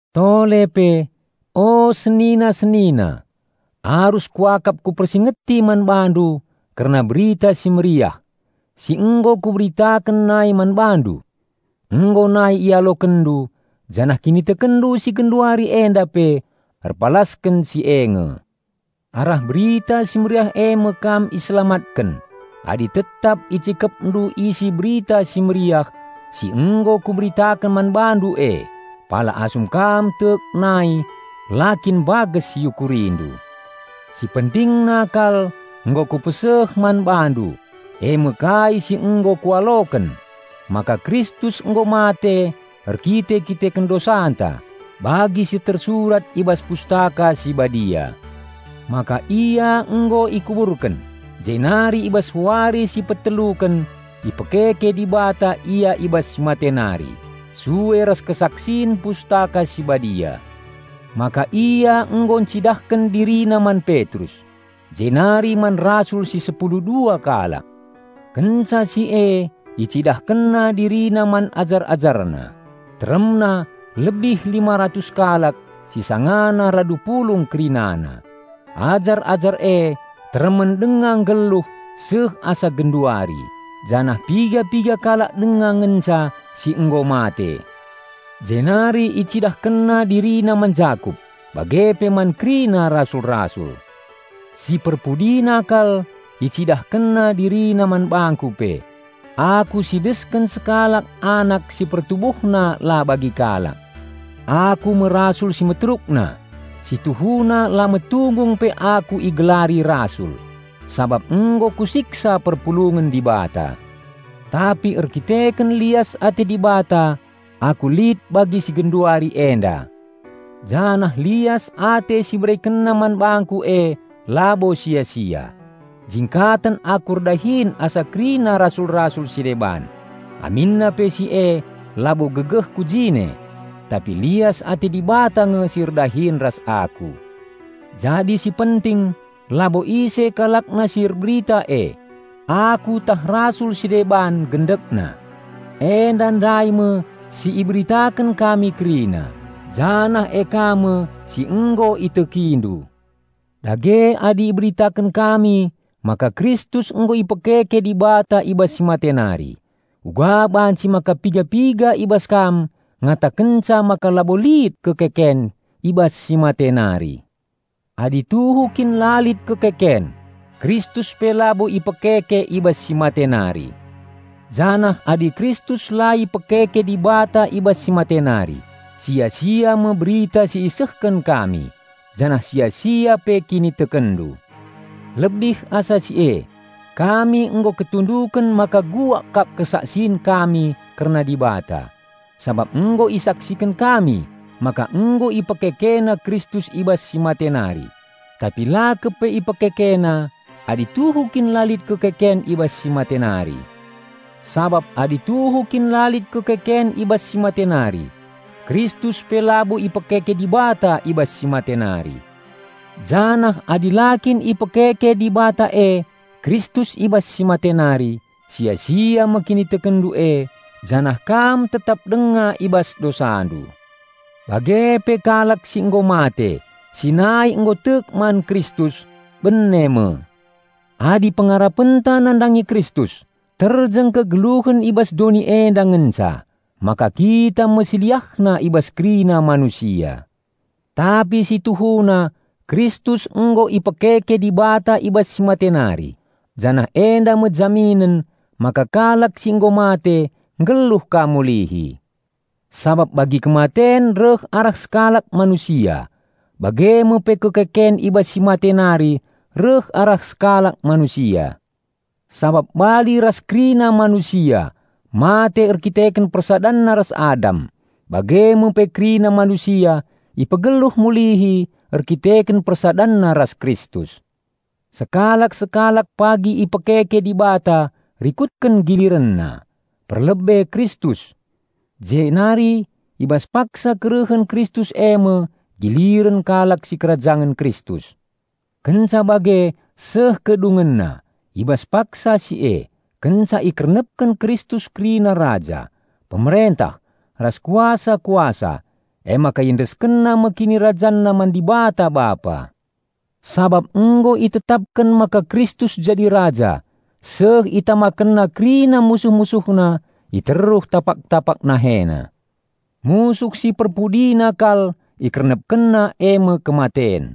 Tole pe, o senina-senina, arus kuakap kupersingeti man bandu kerna Berita Si Mehuli si nggo kuberitaken nai man bandu. Nggo nai ialokenndu, janah kinitekenndu si genduari enda pe erpalasken si e nge. Arah Berita Si Mehuli eme kam iselamatken adi tetap icikepndu isi Berita Si Mehuli si nggo kuberitaken man bandu e, pala asum kam tek nai la kin mbages iukurindu. Si pentingna kal nggo kupeseh man bandu, eme kai si nggo kualoken: maka Kristus nggo mate erkite-kiteken dosanta, bagi si tersurat i bas Pustaka Si Badia. Maka Ia nggo ikuburken, jenari i bas wari si peteluken ipekeke Dibata Ia i bas si mate nari, sue ras kesaksin Pustaka Si Badia. Maka Ia nggo encidahken DiriNa man Petrus, jenari man rasul si sepulu dua kalak. Kenca si e IcidahkenNa DiriNa man ajar-AjarNa, teremna lebih lima ratus kalak si sangana radu pulung kerinana. Ajar-ajar e teremen denga nggeluh seh asa genduari, janah piga-piga kalak denga ngenca si nggo mate. Jenari IcidahkenNa DiriNa man Jakup, bage pe man kerina rasul-rasul. Si perpudina kal, IcidahkenNa DiriNa man bangku pe -- aku si desken sekalak anak si pertubuhna la bagi kalak. Aku me rasul si meterukna -- si tuhuna la metunggung pe aku igelari rasul -- sabap nggo kusiksa perpulungen Dibata. Tapi erdandanken lias ate Dibata aku lit bagi si genduari enda. Janah lias ate si IberekenNa man bangku e labo sia-sia. Jingkaten aku erdahin asa kerina rasul-rasul si deban, aminna pe si e labo gegehku jine, tapi lias ate Dibata nge si erdahin ras aku. Jadi si penting labo ise kalakna si erberita e -- aku tah rasul si deban -- gendekna, enda ndai me si iberitaken kami kerina, janah e ka me si nggo itekindu. Dage adi iberitaken kami maka Kristus nggo ipekeke Dibata i bas si mate nari, uga banci maka piga-piga i bas kam ngatakenca maka labo lit kekeken i bas si mate nari? Adi tuhu kin la lit kekeken, Kristus pe labo ipekeke i bas si mate nari. Janah adi Kristus la ipekeke Dibata i bas si mate nari, sia-sia me berita si isehken kami, janah sia-sia pe kinitekenndu. Lebih asa si e, kami nggo ketunduken maka bual kap kesaksin kami kerna Dibata, sabap nggo isaksiken kami maka nggo IpekekeNa Kristus i bas si mate nari -- tapi la kepe IpekekeNa -- adi tuhu kin la lit kekeken i bas si mate nari. Sabap adi tuhu kin la lit kekeken i bas si mate nari, Kristus pe labo ipekeke Dibata i bas si mate nari. Janah adi la kin ipekeke Dibata e Kristus i bas si mate nari, sia-sia me kinitekenndu e janah kam tetap denga i bas dosandu. Bage pe kalak si nggo mate, si nai nggo tek man Kristus, bene me. Adi pengarapenta nandangi Kristus terjeng kegeluhen i bas doni enda ngenca, maka kita me si liahna i bas kerina manusia. Tapi si tuhuna Kristus nggo ipekeke Dibata i bas si mate nari, janah enda me jaminen maka kalak si nggo mate nggeluh ka mulihi. Sabap bagi kematen reh arah sekalak manusia, bage me pe kekeken i bas si mate nari reh arah sekalak Manusia. Sabap bali ras kerina manusia mate erdandanken persadanna ras Adam, bage me pe kerina manusia ipegeluh mulihi erdandanken persadanna ras Kristus. Sekalak-sekalak pagi ipekeke Dibata rikutken gilirenna: perlebe Kristus; jenari i bas paksa kerehen Kristus eme giliren kalak sikerajangen Kristus. Kenca bage seh kedungenna; i bas paksa si e, kenca ikernepken Kristus kerina raja, pemerentah, ras kuasa-kuasa, emaka IendeskenNa me KinirajanNa man Dibata Bapa. Sabap nggo itetapken maka Kristus jadi raja seh ItamakenNa kerina musuh-MusuhNa i teruh tapak-tapak NaheNa. Musuh si perpudina kal IkernepkenNa eme kematen.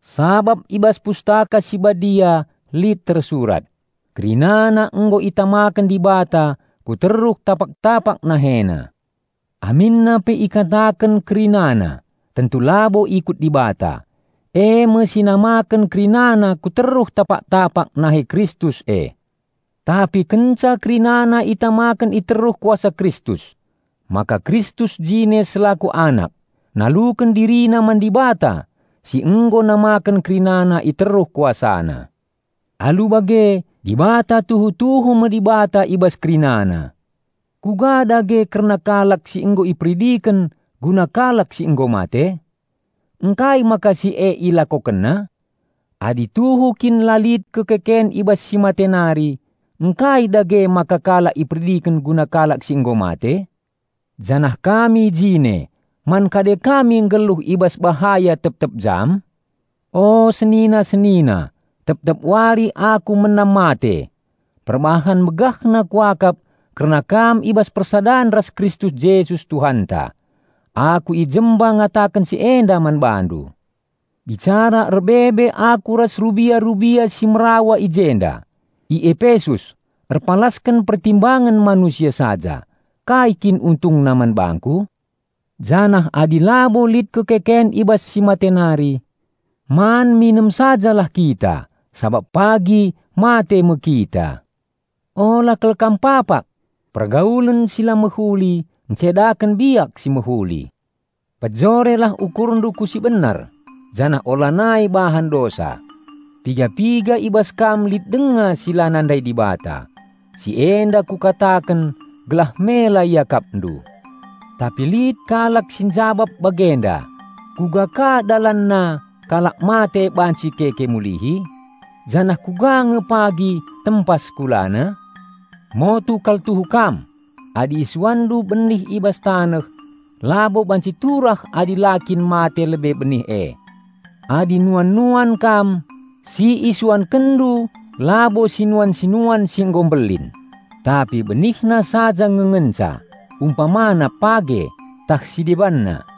Sabap i bas Pustaka Si Badia lit tersurat, "Kerinana nggo itamaken Dibata ku teruh tapak-tapak NaheNa." Aminna pe ikataken "kerinana," tentu labo ikut Dibata, eme si namaken kerinana ku teruh tapak-tapak nahe Kristus e. Tapi kenca kerinana itamaken i teruh kuasa Kristus, maka Kristus jine selaku Anak, naluken DiriNa man Dibata si nggo namaken kerinana i teruh KuasaNa. Alu bage, Dibata tuhu-tuhu me Dibata i bas kerinana. Kuga dage kerna kalak si nggo iperidiken guna kalak si nggo mate? Ngkai maka si e ilakokenna? Adi tuhu kin la lit kekeken i bas si mate nari, ngkai dage maka kalak iperidiken guna kalak si nggo mate? Janah kami jine, man kade kami nggeluh i bas bahaya tep-tep jam? O senina-senina, tep-tep wari aku menam mate. Perbahan megahna kuakap kerna kam i bas persadan ras Kristus Jesus Tuhanta, aku i jemba ngataken si enda man bandu. Bicara erbebe aku ras rubia-rubia si merawa i jenda, i Epesus, erpalasken pertimbangen manusia saja, kai kin untungna man bangku? Janah adi labo lit kekeken i bas si mate nari, "Man minem sajalah kita, sabap pagi mate me kita." Ula kal kam papak! "Pergaulen si la mehuli, ncedaken biak si mehuli." Pejorelah ukurndu ku si benar, janah ulanai bahan dosa. Piga-piga i bas kam lit denga si la nandai Dibata. Si enda kukataken gelah mela iakapndu. Tapi lit kalak si njabap bagenda, "Kuga ka dalanna kalak mate banci keke mulihi? Janah kuga nge pagi tempas kulana?" Motu kal tuhu kam! Adi isuanndu benih i bas taneh, labo banci turah adi la kin mate lebe benih e. Adi nuan-nuan kam, si isuankenndu labo sinuan-sinuan si nggo mbelin, tapi benihna saja nge ngenca, umpamana page, tah si debanna.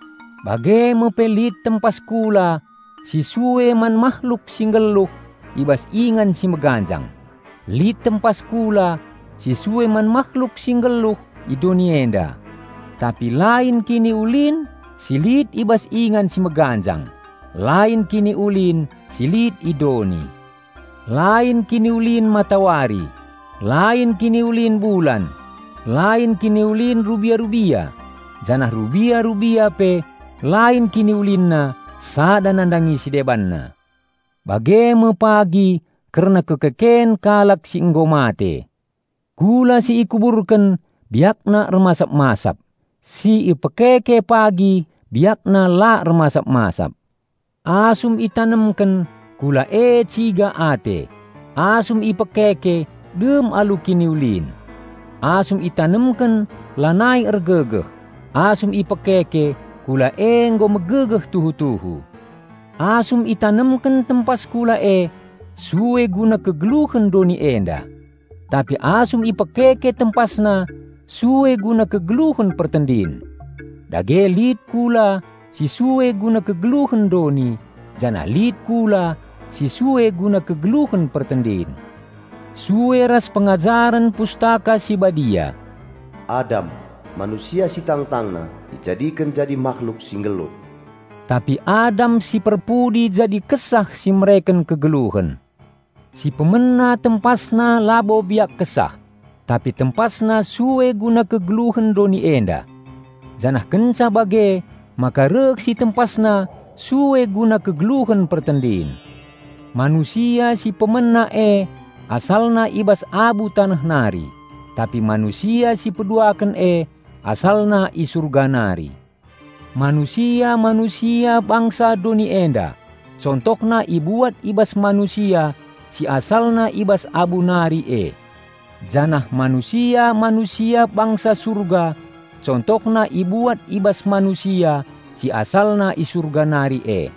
Bage me pe lit tempas kula si sue man mahluk si nggeluh i bas ingan si meganjang, lit tempas kula si sue man mahluk si nggeluh i doni enda. Tapi lain kiniulin si lit i bas ingan si meganjang, lain kiniulin si lit i doni. Lain kiniulin matawari, lain kiniulin bulan, lain kiniulin rubia-rubia; janah rubia-rubia pe lain kiniulinna sada nandangi si debanna. Bage me pagi kerna kekeken kalak si nggo mate. Kula si ikuburken biakna ermasap-masap; si ipekeke pagi biakna la ermasap-masap. Asum itanemken, kula e ciga ate; asum ipekeke dem alu kiniulin. Asum itanemken lanai ergegeh; asum ipekeke kula e nggo megegeh tuhu-tuhu. Asum itanemken tempas kula e sue guna kegeluhen doni enda; tapi asum ipekeke tempasna sue guna kegeluhen pertendin. Dage lit kula si sue guna kegeluhen doni, janah lit kula si sue guna kegeluhen pertendin. Sue ras pengajaren Pustaka Si Badia, "Adam, manusia si tangtangna, ijadiken jadi mahluk si nggeluh"; tapi Adam si perpudi jadi Kesah si mereken Kegeluhen. Si pemena tempasna labo biak Kesah, tapi tempasna sue guna kegeluhen doni enda; janah kenca bage maka reh si tempasna sue guna kegeluhen pertendin. Manusia si pemena e asalna i bas abu taneh nari; tapi Manusia sipeduaken e AsalNa i Surga nari. Manusia-manusia bangsa doni enda contohna ibuat i bas manusia si asalna i bas abu nari e; janah manusia-manusia bangsa Surga contohna ibuat i bas Manusia si AsalNa i Surga nari e.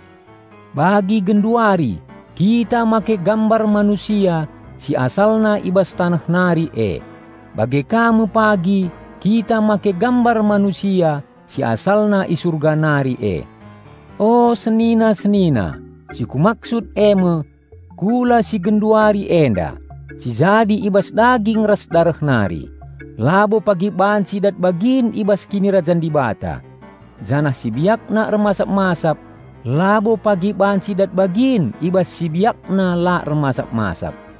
Bagi genduari kita make gambar manusia si asalna i bas taneh nari e, bage ka me pagi kita make gambar Manusia si AsalNa i Surga nari e. O senina-senina, si kumaksud eme: kula si genduari enda, si jadi i bas daging ras dareh nari, labo pagi banci dat bagin i bas Kinirajan Dibata, janah si biakna ermasap-masap labo pagi banci dat bagin i bas si biakna la ermasap-masap.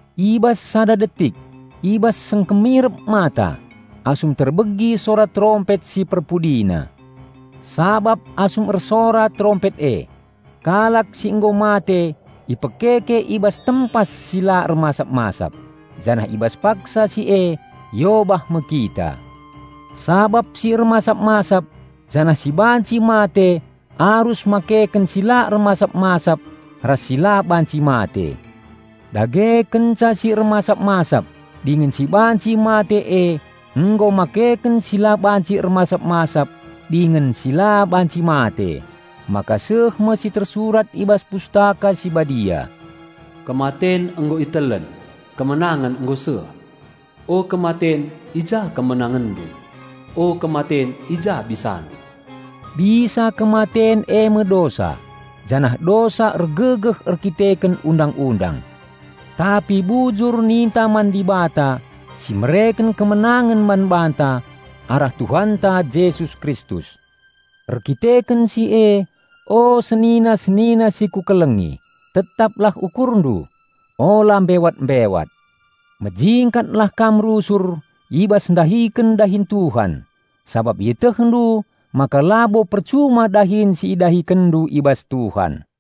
I bas sada detik, i bas singkemirep mata, asum terbegi sora terompet si perpudina. Sabap asum ersora terompet e, kalak si nggo mate ipekeke i bas tempas si la ermasap-masap, janah i bas paksa si e iobah me kita. Sabap si ermasap-masap janah si banci mate arus makeken si la ermasap-masap ras si la banci mate. Dage kenca si ermasap-masap dingen si banci mate e nggo makeken si la banci ermasap-masap dingen si la banci mate, maka seh me si tersurat i bas Pustaka Si Badia, "Kematen nggo itelen, kemenangen nggo seh." "O kematen, i ja kemenangenndu? O kematen, i ja bisandu?" Bisa kematen eme dosa, janah dosa ergegeh erdandanken Undang-undang. Tapi bujur ninta man Dibata si mereken kemenangen man banta arah Tuhanta Jesus Kristus. Erdandanken si e, o senina-senina si kukelengi, tetaplah ukurndu, ula mbewat-mbewat. Mejingkatlah kam rusur i bas ndahiken dahin Tuhan, sabap ietehndu maka labo percuma dahin si idahikenndu i bas Tuhan.